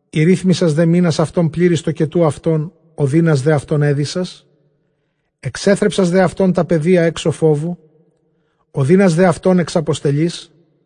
ἠρίθμησας δὲ μῆνας αὐτῶν πλήρεις τοκετοῦ αὐτῶν, ὠδῖνας δὲ αὐτῶν ἔλυσας, ἐξέθρεψας δὲ αὐτῶν τὰ παιδία ἔξω φόβου, ὠδῖνας δὲ αὐτῶν ἐξαποστελεῖς,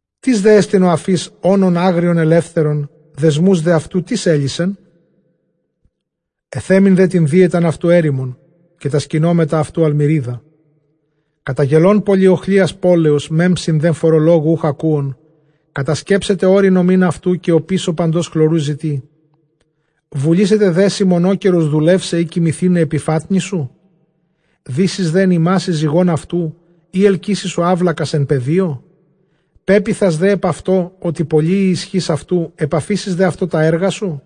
Τίς δέ ἐστιν ὁ ἀφεὶς ὄνον ἄγριον ἐλεύθερον; δεσμοὺς δὲ αὐτοῦ τίς ἔλυσεν; Ἐθέμην δὲ τὴν δίαιταν αὐτοῦ ἔρημον, καὶ τὰ σκηνώματα αὐτοῦ ἁλμυρίδα. Καταγελῶν πολυοχλίας πόλεως, μέμψιν δὲ φορολόγου οὐκ ἀκούων, κατασκέψεται ὄρη νομὴν αὐτοῦ, καὶ ὀπίσω παντὸς χλωροῦ ζητεῖ. Βουλήσεται δέ σοι μονόκερως δουλεῦσαι, ἢ κοιμηθῆναι ἐπὶ φάτνης σου; Δήσεις δὲ ἐν ἱμᾶσι ζυγὸν αὐτοῦ, ἢ ἑλκύσει σου αὔλακας ἐν πεδίῳ; Πέποιθας δὲ ἐπʼ αὐτῷ, ὅτι πολλὴ ἡ ἰσχὺς αὐτοῦ, ἐπαφήσεις δὲ αὐτῷ τὰ ἔργα σου;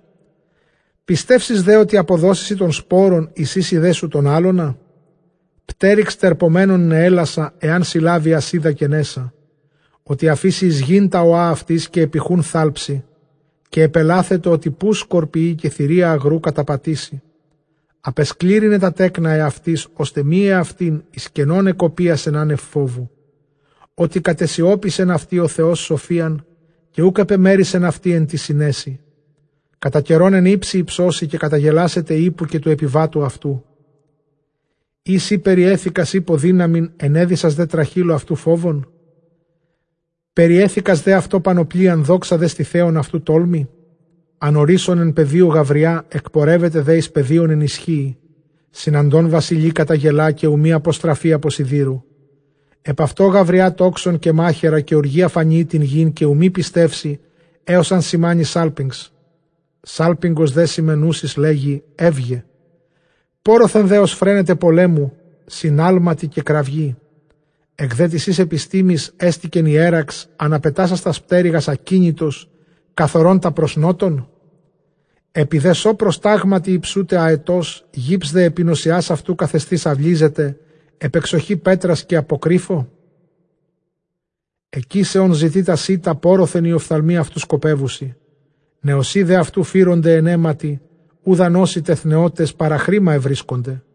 Πιστεύσεις δὲ, ὅτι ἀποδώσει σοι τὸν σπόρον, εἰσοίσει δέ σου τὸν ἅλωνα; Πτέρυξ τερπομένων νεέλασσα, ἐὰν συλλάβῃ ἁσίδα καὶ νέσσα· Ὅτι ἀφήσει εἰς γῆν τὰ ὠὰ αὐτῆς, καὶ ἐπὶ χοῦν θάλψει, καὶ ἐπελάθετο, ὅτι ποῦς σκορπιεῖ, καὶ θηρία ἀγροῦ καταπατήσει. Ἀπεσκλήρυνε τὰ τέκνα ἑαυτῆς, ὥστε μὴ ἑαυτήν· εἰς κενὸν ἐκοπίασεν ἄνευ φόβου. Ὅτι κατεσιώπησεν αὐτῇ ὁ Θεὸς σοφίαν, καὶ οὐκ ἐπεμέρισεν αὐτῇ ἐν τῇ συνέσει. Κατὰ καιρὸν ἐν ὕψει ὑψώσει, καταγελάσεται ἵππου, καὶ τοῦ ἐπιβάτου αὐτοῦ. Ἢ σὺ περιέθηκας ἵππῳ δύναμιν, ἐνέδυσας δὲ τραχήλῳ αὐτοῦ φόβον; Περιέθηκας δὲ αὐτῷ πανοπλίαν; δόξαν δὲ στηθέων αὐτοῦ τόλμῃ. Ἀνορύσσων ἐν πεδίῳ γαυριᾷ, ἐκπορεύεται δὲ εἰς πεδίον ἐν ἰσχύϊ. Συναντῶν βασιλεῖ καταγελᾷ, καὶ οὐ μὴν ἀποστραφῇ ἀπὸ σιδήρου. Ἐπʼ αὐτῷ γαυριᾷ τόξον καὶ μάχαιρα, καὶ ὀργὴ ἀφανιεῖ τὴν γῆν· καὶ οὐ μὴ πιστεύσει, ἕως ἂν σημάνῃ σάλπιγξ. Σάλπιγγος δὲ σημαινούσης, λέγει, εὖγε· πόῤῥωθεν δὲ ὀσφραίνεται πολέμου σὺν ἅλματι καὶ κραυγῇ. Ἐκ δὲ τῆς σῆς ἐπιστήμης ἕστηκεν ἱέραξ, ἀναπετάσας τὰς πτέρυγας, ἀκίνητος, καθορῶν τὰ πρὸς Νότον; Ἐπὶ δὲ σῷ προστάγματι ὑψοῦται ἀετὸς, γὺψ δὲ ἐπὶ νοσσιᾶς αὐτοῦ καθεσθεὶς αὐλίζεται, ἐπʼ ἐξοχῇ πέτρας, καὶ ἀποκρύφῳ, ἐκεῖσε ὢν ζητεῖ τὰ σῖτα, πόῤῥωθεν οἱ ὀφθαλμοὶ αὐτοῦ σκοπεύουσι. Νεοσσοὶ δὲ αὐτοῦ φύρονται ἐν αἵματι, οὗ δʼ ἂν ὦσι τεθνεῶτες, παραχρῆμα εὑρίσκονται.